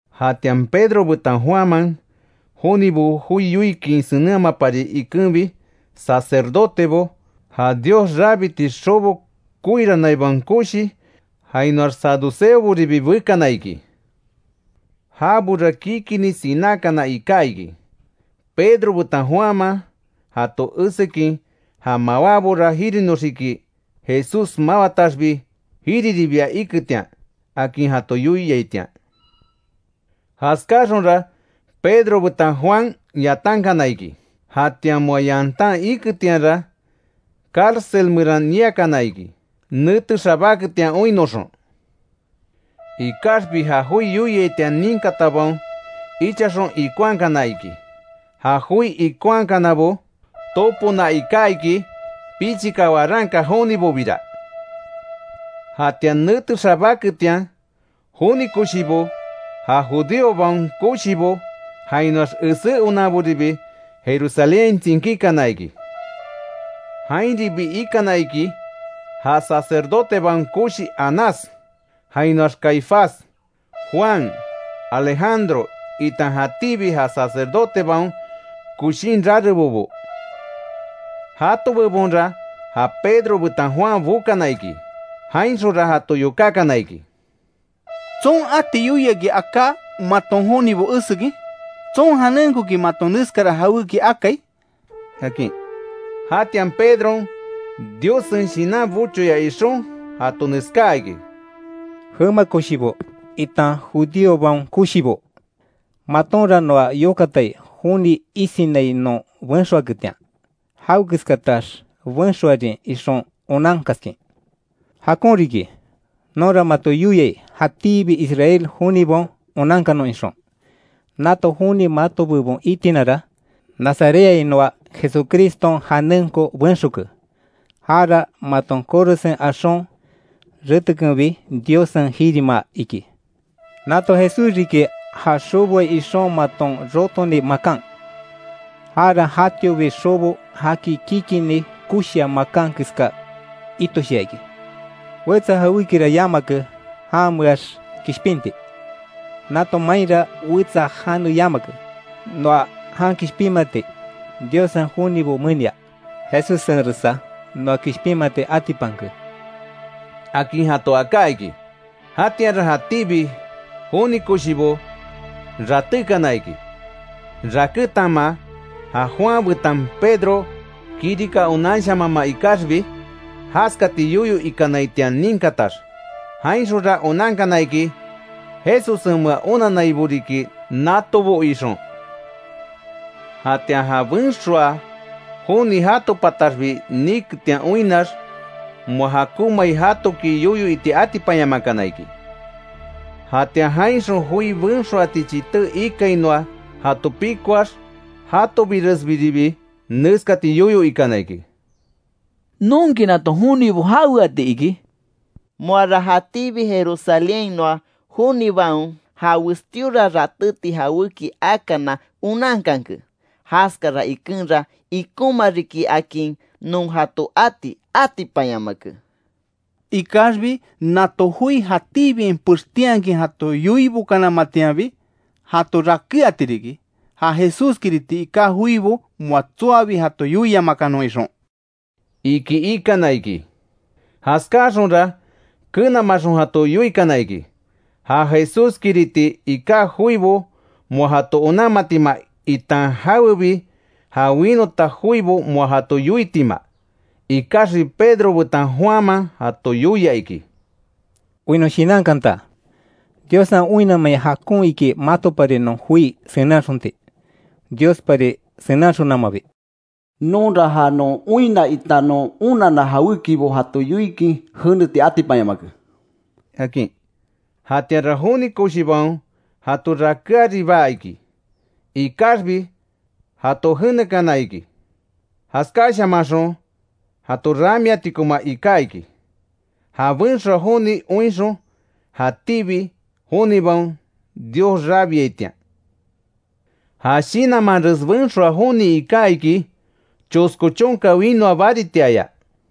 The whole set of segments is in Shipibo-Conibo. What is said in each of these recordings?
Jatian Pedro betan Juanman, jonibo joi yoikin senenhamapari ikenbi, sacerdotebo, ja Dios rabiti xobo koiranaibaon koshi, jainoax saduceoboribi bekana iki. Jabora kikinni sinákana iká iki, Pedro betan Juanman jato esekin, ja Mawábora jirinoxiki, Jesús mawataxbi, jiriribia iketian akin jato yoiaitian. Jaskáxonra, Pedro betan Juan yatankana iki. Jatian moa yantan iketianra, cárcel meran niakana iki, nete xabáketian oinnoxon. Ikaxbi ja joi yoiaitian ninkatabaon, ichaxon ikonhakana iki. Ja joi ikonhakanabo topona iká iki, pichika waranka jonibobira. Jatian nete xabáketian, joni koshibo, ja judíobaon koshibo, jainoax esé onanboribi Jerusalénhain tsinkíkana iki. Jainribi ikana iki, ja sacerdotebaon koshi Anás, jainoax Caifás, Juan, Alejandro, itan jatíbi ja sacerdotebaon koshin rarebobo. Jato bebonra ja Pedro betan Juan bokana iki. Jainxonra jato yokákana iki: —¿Tson ati yoiaki aká maton jonibo esekin? ¿Tson janenkoki maton neskara jawéki akai? —akin. Jatian Pedron Diossen Shinan bochoya ixon jato neskaa iki: —Jema koshibo, itan judíobaon koshibo: Matonra noa yokatai joni isinai non benxoaketian, jawekeskatax benxoarin ixon onankaskin. Jakon riki, nonra mato yoiai jatíbi Israel jonibaon onankanon ixon. Nato joni mato bebon itinara, nazarethainoa Jesucriston janenko benxoke. Jara maton korosen axon retekenbi, Diossen jirimaa iki. Nato Jesús riki ja xoboai ixon maton rotoni makan, jara jatiobi xobo jaki kikinni koshia makan keska itoshia iki. Wetsa jawékira yamake janmeax kishpinti; nato mainra wetsa jane yamake, noa jan kishpinmati Diossen jonibo menia. Jesussenresa noa kishpinmati atipanke —akin jato aká iki. Jatianra jatíbi joni koshibo ratékana iki, rakétanma ja Juan betan Pedro kirika onanshamanma ikaxbi, jaskati yoyo ikanaitian ninkatax, jainxonra onankana iki, Jesussenmea onannaibo riki natobo ixon. Jatian ja benxoaa joni jato pataxbi niketian oinnax, moa jakonmai jatoki yoyo iti atipanyamakana iki. Jatian jainxon joi benxoati chité ikainoa jato pikoax, jatobiresbiribi neskati yoyo ikana iki: —¿Nonki nato jonibo jaweatiki? Moara jatíbi Jerusalénhainoa jonibaon, ja westíora ratéti jawéki akana onankanke, jaskara ikenra ikonma riki akin non jato ati atipanyamake. Ikaxbi nato joi jatíbiain pextinhakin jato yoibokanamatianbi jato rakéati riki, ja Jesús kiriti iká joibo moa tsoabi jato yoiamakanon ixon —iki ikana iki. Jaskáaxonra, kenamaxon jato yoikana iki, ja Jesús kiriti iká joibo moa jato onanmatima itan jawebi ja winota joibo moa jato yoitima. Ikaxbi Pedro betan Juanman jato yoia iki: —Oinnon shinankanta, Diossen oinnamein jakon iki matopari non joi senenhaxonti, Diospari senenhaxonamabi. Nonra ja non oinna itan non onanna jawékibo jato yoikin jeneti atipanyamake —akin. Jatianra joni koshibaon jato rakéaribaa iki, ikaxbi jato jenekana iki, jaskáshamanxon jato ramiatikoma iká iki, ja benxoa joni oinxon jatíbi jonibaon Dios rabiaitian. Ja shinanmanres benxoa joni iká iki, chosko chonka winoa baritiaya.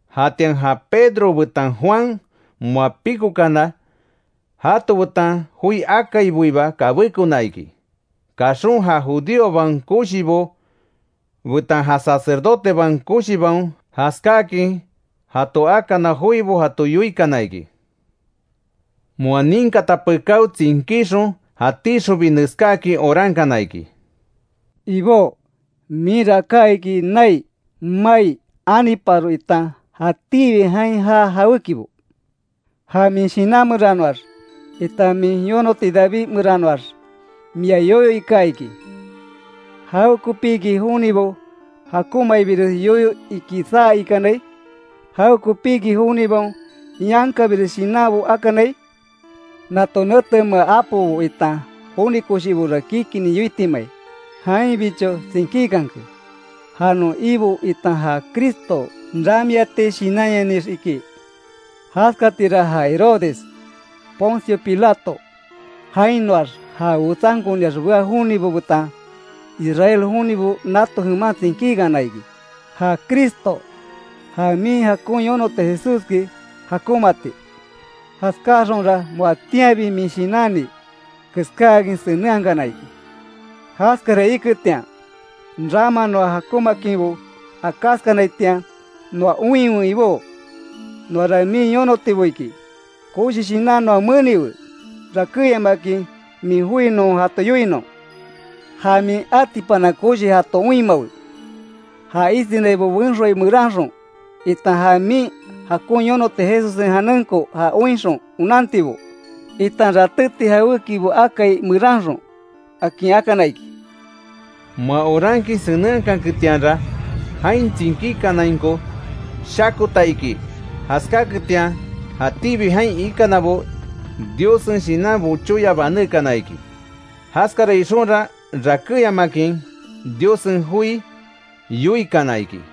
Jatian ja Pedro betan Juan moa pikókana, jato betan joi akaiboiba kabékona iki; kaxon ja judíobaon koshibo betan ja sacerdotebaon koshibaon jaskáakin jato akana joibo jato yoikana iki. Moa ninkata pekáo, tsinkíxon jatíxonbi, neskáakin orankana iki: “Ibó, minra aká iki nai, mai, aniparo itan jatíbi jain jaa jawékibo. Ja min Shinan meranoax, itan min yonoti David meranoax mia yoyo ika iki: ‘¿Jawekopiki jonibo jakonmaibires yoyo iki saa ikanai? ¿Jawekopiki jonibaon yankabires shinanbo akanai? Nato netemea apobo itan joni koshibora kikini yoitimai, jainbicho tsinkíkanke ja non Ibo itan ja Cristo ramiati shinanyanix’, iki. Jaskatira ja Herodes, Poncio Pilato, jainoax ja wetsankoniax bea jonibo betan, Israel jonibo nato jeman tsinkíkana iki, ja Cristo, ja min jakon yonoti Jesúski jakonmaati. Jaskáxonra moatianbi min shinanni keskáakin senenhakana iki. Jaskara iketian, rama noa jakonmaakinbo akáskanaitian noa oinwe Ibó; noara min yonotibo iki koshi shinan noa meniwe, rakéyamakin min joi non jato yoinon. Ja min atipana koshi jato oinmawe, ja isinaibo benxoai meranxon, itan ja min jakon yonoti Jesussen janenko ja oinxon onantibo, itan ratéti jawékibo akai meranxon”, akin akana iki. Moa orankin senenhakanketianra, jain tsinkíkanainko shakota iki, jaskáketian jatíbi jain ikanabo Diossen Shinan bochoya banékana iki; jaskara ixonra, rakéyamakin Diossen joi yoikana iki.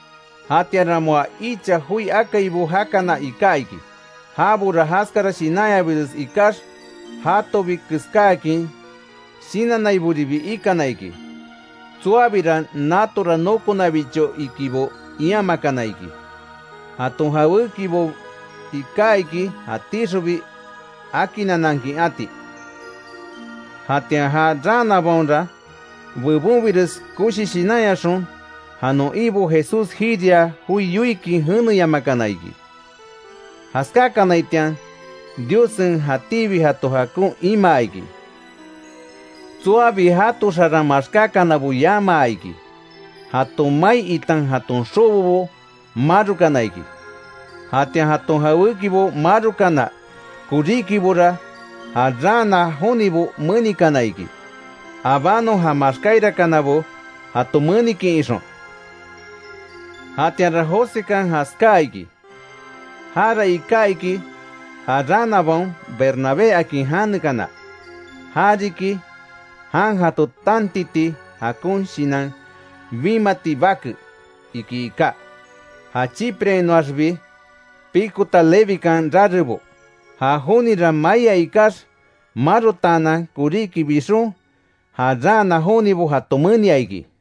Jatianra moa icha joi akaibo jakana iká iki, jabora jaskara shinanyabires ikax, jatobi keskáakin shinannaiboribi ikana iki; tsoabira natora nokonabicho ikibo iamakana iki, jaton jawékibo iká iki jatíxonbi akinanankin ati. Jatian ja raanabaonra, bebonbires koshi shinanyaxon, ja non Ibo Jesús jiria joi yoikin jeneyamakana iki. Jaskákanaitian Diossen jatíbi jato jakon imaa iki. Tsoabi jato xaran maxkákanabo yamaa iki; jaton mai itan jaton xobobo marokana iki. Jatian jaton jawéki marokana koríkibora ja raana jonibo menikana iki, abanon ja maxkáirakanabo jato menikin, ixon. Jatianra Josekan jaskáa iki, jara iká iki ja raanabaon Bernabé akin janekana, (ja riki: “Jan jato tantiti jakon shinan bimati bake”, iki iká). Ja Chipreainoaxbi pikota Levikan rarebo. Ja jonira maia ikax, marotaanan koríki bixon, ja raana jonibo jato menia iki.